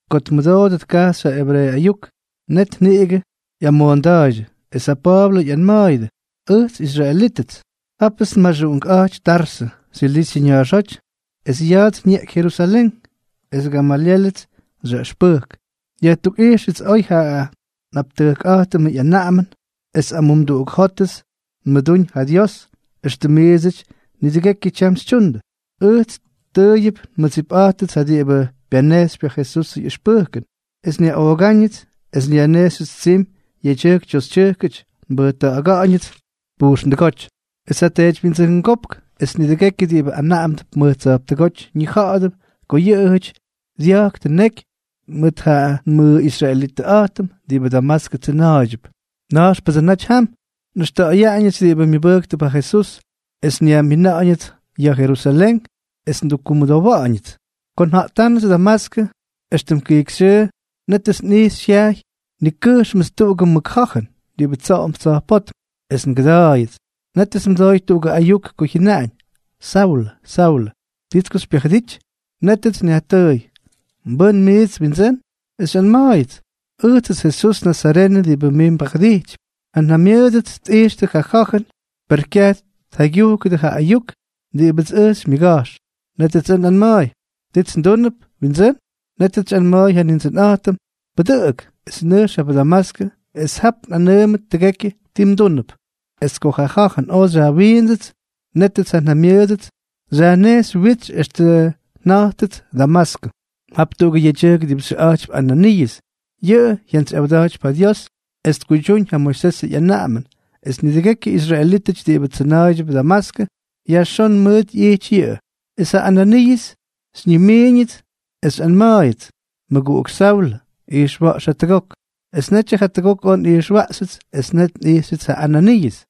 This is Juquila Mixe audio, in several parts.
Ko tmʉdoodʉ tkajxy ja ebreeʉ ayuk, net niꞌigʉ ꞌyamoonda̱a̱ydyʉ. Es ja Pa̱a̱blʉ ꞌyanma̱a̱yʉdʉ: —Ʉj israelítʉts, japts nmaxuꞌunkꞌa̱jty Tarsʉ, Silisyʉ ña̱a̱xóty, es ya̱a̱ts nyeꞌky Jerusalén es Gamalyélʉts xyaꞌʉxpʉjk. Yajtukꞌijxʉts oy ja nꞌaptʉjkꞌa̱jtʉmʉ ꞌyanaꞌamʉn es amumduꞌuk jótʉts nmʉdúñ ja Dios, éxtʉm miidsʉty nidʉgekyʉ tyam xytyundʉ. Ʉjts tʉʉyʉp nmʉdsipꞌa̱jtʉts yʉ diꞌibʉ pyanejxypy ja Jesusʉ ꞌyʉxpʉjkʉn, extʉ nyaꞌoogánʉts es nyajnejxyʉts tsimy yedyʉjk toxytyʉjk, mbʉjta̱ꞌa̱ga̱ꞌa̱ñʉts pujxndʉgóty. Es ja teedywyindsʉngópk es nidʉgekyʉ diꞌibʉ anaꞌamdʉp mʉj tsa̱jptʉgóty ñija̱ꞌa̱dʉp ko yʉꞌʉjʉty dya̱jktʉ neky mʉt ja nmʉꞌisraelitʉꞌa̱jtʉm diꞌibʉ Damaskʉ tsʉna̱a̱ydyʉp. Nʉjxpʉdsʉ naty jam, nꞌʉxta̱ꞌa̱yaꞌañʉts diꞌibʉ myʉbʉjktʉp ja Jesús, es nyajmina̱ꞌa̱ñʉts ya̱ Jerusalén es ndukkumʉdowa̱ꞌa̱ñʉts. ’Ko nja̱ꞌtánʉts Damaskʉ, éxtʉm kijkyxyʉʉ, nétʉts nꞌijxy jyajy nikʉjxmʉts tuꞌugʉ mʉk ja̱jʉn diꞌibʉ tsa̱jpótm tsoꞌomp, es ngʉda̱a̱yʉts. Nétʉts nmʉdooy tuꞌugʉ ayuk ko jyʉnaꞌañ: “Saulʉ, Saulʉ, ¿Tits ko xypyajʉdity?” Nétʉts nyajtʉʉy: “¿Mbʉ́n mijts?, Windsʉ́n.” Es xyꞌanma̱a̱yʉts: “Ʉjtsʉts Jesús nazarenʉ diꞌibʉ mij mbajʉdijtypy.” Ja njamyʉʉdʉts tꞌijxtʉ ja ja̱jʉn, per kyaj tjaygyujkʉdʉ ja ayuk diꞌibʉts ʉj xymyʉga̱jx. Nétʉts ʉj nꞌanma̱a̱y: “¿Tits ndúnʉp?, Windsʉ́n.” Nétʉts xyꞌanma̱a̱y ja Nindsʉnꞌa̱jtʉm: “Pʉdʉꞌʉk es nʉjx jap Damaskʉ es jap mꞌanʉʉmʉdʉt tʉgekyʉ ti mdúnʉp.” ’Es ko ja ja̱jʉn oj xyajwiindsʉts, nétʉts ja njamyʉʉdʉts xyajnejxy witsy extʉ nja̱jtyʉts Damaskʉ. ’Jap tuꞌugʉ yedyʉjk diꞌibʉ xyʉꞌa̱jtypy Ananiiʉs. Yʉꞌʉ jyantsyꞌawda̱jtypy ja Dios es tkuydyúñ ja Moisesʉ ꞌyanaꞌamʉn, es nidʉgekyʉ israelítʉty diꞌibʉ tsʉna̱a̱ydyʉ Damaskʉ yajxón mʉʉt ꞌyijty yʉꞌʉ. Es ja Ananiiʉs xyñimiiñʉts es xyꞌanma̱a̱yʉts: “Mʉguꞌuk Saulʉ, ijxwa̱ꞌx jatʉgok.” Es netyʉ jatʉgok oj nꞌijxwaꞌxyʉts es net nꞌijxyʉts ja Ananiiʉs.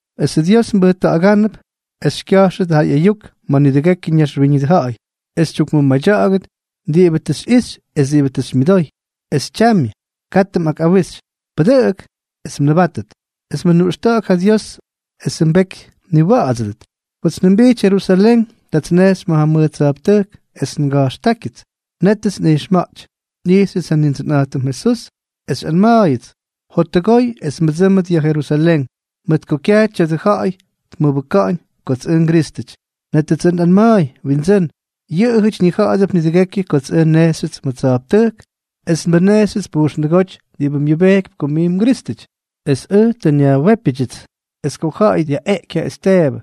Esʉ Dios mbʉjta̱ꞌa̱gánʉp es xykya̱jxʉt ja ꞌyayuk ma̱ nidʉgekyʉ naxwíñʉdʉ ja̱ꞌa̱y, es xytyukmʉmadya̱ꞌa̱gʉt diꞌibʉ tʉ xyꞌixy es diꞌibʉ tʉ xymyʉdoy. Es tyamyʉ, katʉ mꞌakꞌawix. Pʉdʉꞌʉk es mnʉbátʉt, es mʉnuꞌxta̱ꞌa̱k ja Dios esʉ mbeky mniwa̱ꞌa̱dsʉdʉt.” ’Kots njʉmbijty Jerusalén, tats nnejxy ma̱ mʉj tsa̱jptʉjk es nga̱jxtákyʉts. Nétʉts nꞌijxma̱ꞌty. Nꞌijxyʉts ja Nindsʉnꞌa̱jtʉm Jesús, es xyꞌanma̱a̱yʉts: “Jottʉgoy es mbʉdsʉ́mʉt ya̱ Jerusalén, mʉt ko kyaj tya̱dʉ ja̱ꞌa̱y tmʉbʉka̱ꞌa̱ñ kots ʉj nGrístʉty.” ’Nétʉts ʉj nꞌanma̱a̱y: “Windsʉ́n, yʉꞌʉjʉty ñija̱ꞌa̱dʉp nidʉgekyʉ kots ʉj nnejxyʉts ma̱ tsa̱jptʉjk es nmʉnejxyʉts pujxndʉgóty diꞌibʉ myʉbejkypy ko mij mGrístʉty, es ʉj tʉ nyajwépyʉdyʉts. Es ko ja ja̱ꞌa̱y dyaꞌeꞌky ja Esteebʉ,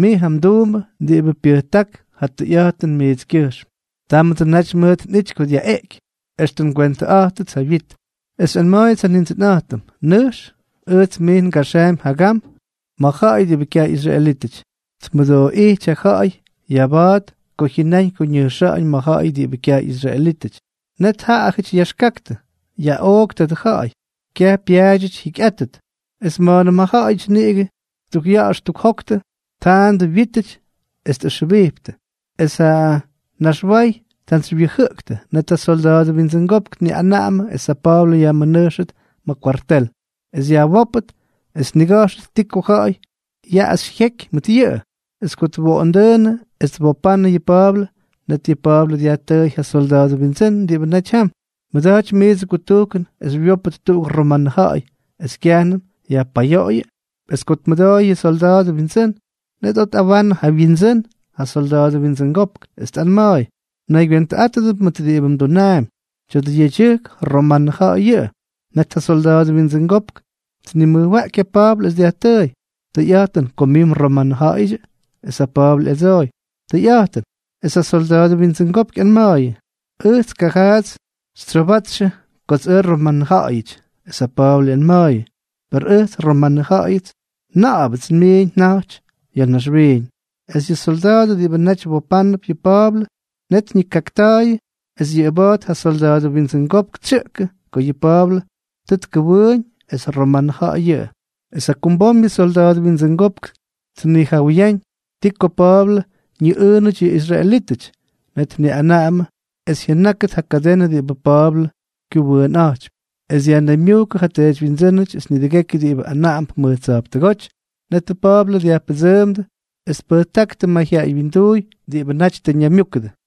mij ja mduumbʉ diꞌibʉ pyʉjták ja tʉyꞌa̱jtʉn mijtskyʉjxm, támʉdsʉ naty mʉt nꞌity ko dyaꞌeꞌky, extʉ ngwentʉꞌa̱jtʉts ja wyit.” Es xyꞌanma̱a̱yʉts ja Nindsʉnꞌa̱jtʉm: “Nʉjx. Ʉjts mij ngaxaampy jagam ma̱ ja̱ꞌa̱y kyaj ꞌyisraelítʉty.” Tmʉdooꞌijty ja ja̱ꞌa̱y ya̱a̱ba̱a̱t ko jyʉnáñ ko ñʉjxa̱ꞌa̱ñ ma̱ ja̱ꞌa̱y diꞌibʉ kyaj ꞌyisraelítʉty. Net ja ja̱ꞌa̱yʉty yaxkaktʉ: —¡Yaꞌook tadʉ ja̱ꞌa̱y! ¡Kyaj pyaadyʉty jyikyꞌátʉt! Es ma̱a̱nʉm ja ja̱ꞌa̱yʉty niꞌigʉ ttukꞌya̱ꞌa̱x ttukjoktʉ, tjandʉ wyítʉty es tꞌʉxjʉbiptʉ, es ja naxway tjantsywyʉjʉꞌʉktʉ, net ja solda̱a̱dʉ windsʉngopk tniꞌanaꞌamʉ es ja Pa̱a̱blʉ yajmʉnʉjxʉt ma̱ kwartel, es yajwópʉt es tniga̱jxʉt ti ko ja̱ꞌa̱y yaꞌaxy jyeky mʉt yʉꞌʉ. Es ko twoꞌondʉʉnʉ es twopandʉ yʉ Pa̱a̱blʉ, net yʉ Pa̱a̱blʉ dyajtʉʉy ja solda̱a̱dʉ windsʉ́n diꞌibʉ naty jam: —¿Mmʉda̱jtypy miidsʉ kutujkʉn es xywyópʉt tuꞌugʉ romanʉ ja̱ꞌa̱y, es kyajnʉm yajpayoꞌoyʉ? Es ko tmʉdooy yʉ solda̱a̱dʉ windsʉ́n, net oj tꞌawanʉ ja wyindsʉ́n, ja solda̱a̱dʉ windsʉngopk, es tꞌanma̱a̱y: —Mnaygywentʉꞌátʉdʉp mʉt diꞌibʉ mdunaampy. Tya̱dʉ yedyʉjk, romanʉ ja̱ꞌa̱y yʉꞌʉ. Net ja solda̱a̱dʉ windsʉngopk tnimʉjwaꞌky ja Pa̱a̱blʉ, es dyajtʉʉy: —¿Tʉyꞌa̱jtʉn ko mij mromanʉja̱ꞌa̱yʉdyʉ? Es ja Pa̱a̱blʉ ꞌyadsooy: —Tʉyꞌa̱jtʉn. Es ja solda̱a̱dʉ windsʉngopk ꞌyanma̱a̱yʉ: —Ʉjts kajaats xytsyoobátxʉ kots ʉj nromanʉja̱ꞌa̱yʉty. Es ja Pa̱a̱blʉ ꞌyanma̱a̱yʉ: —Per ʉjts romanʉ ja̱ꞌa̱yʉts na̱ꞌa̱bʉts nmiiñ nja̱jty ya̱ naxwiiñ. Es yʉ solda̱a̱dʉ diꞌibʉ naty wopánʉp yʉ Pa̱a̱blʉ, net ñikakta̱a̱yʉdʉ, es yʉꞌʉba̱a̱t ja solda̱a̱dʉ windsʉngopk tsyʉꞌkʉ ko yʉ Pa̱a̱blʉ tʉ tkʉwʉʉñ es romanʉ ja̱ꞌa̱y yʉꞌʉ. Es jakumbom yʉ solda̱a̱dʉ windsʉngopk tnijawʉyáñ ti ko Pa̱a̱blʉ ñiꞌʉʉnʉty yʉ israelítʉty. Net tniꞌanaꞌamʉ es jyʉnákʉt ja kadenʉ diꞌibʉ Pa̱a̱blʉ kyʉꞌʉwʉꞌʉnꞌa̱jtypy, es dyajnaymyujkʉ yʉ teedywyindsʉ́nʉty es nidʉgekyʉ diꞌibʉ anaꞌamdʉp mʉj tsa̱jptʉgóty. Netʉ Pa̱a̱blʉ dyajpʉdsʉʉmdʉ es tpʉjtáktʉ mayjyaꞌay wyinduuy diꞌibʉ naty tʉ ñaymyúkʉdʉ.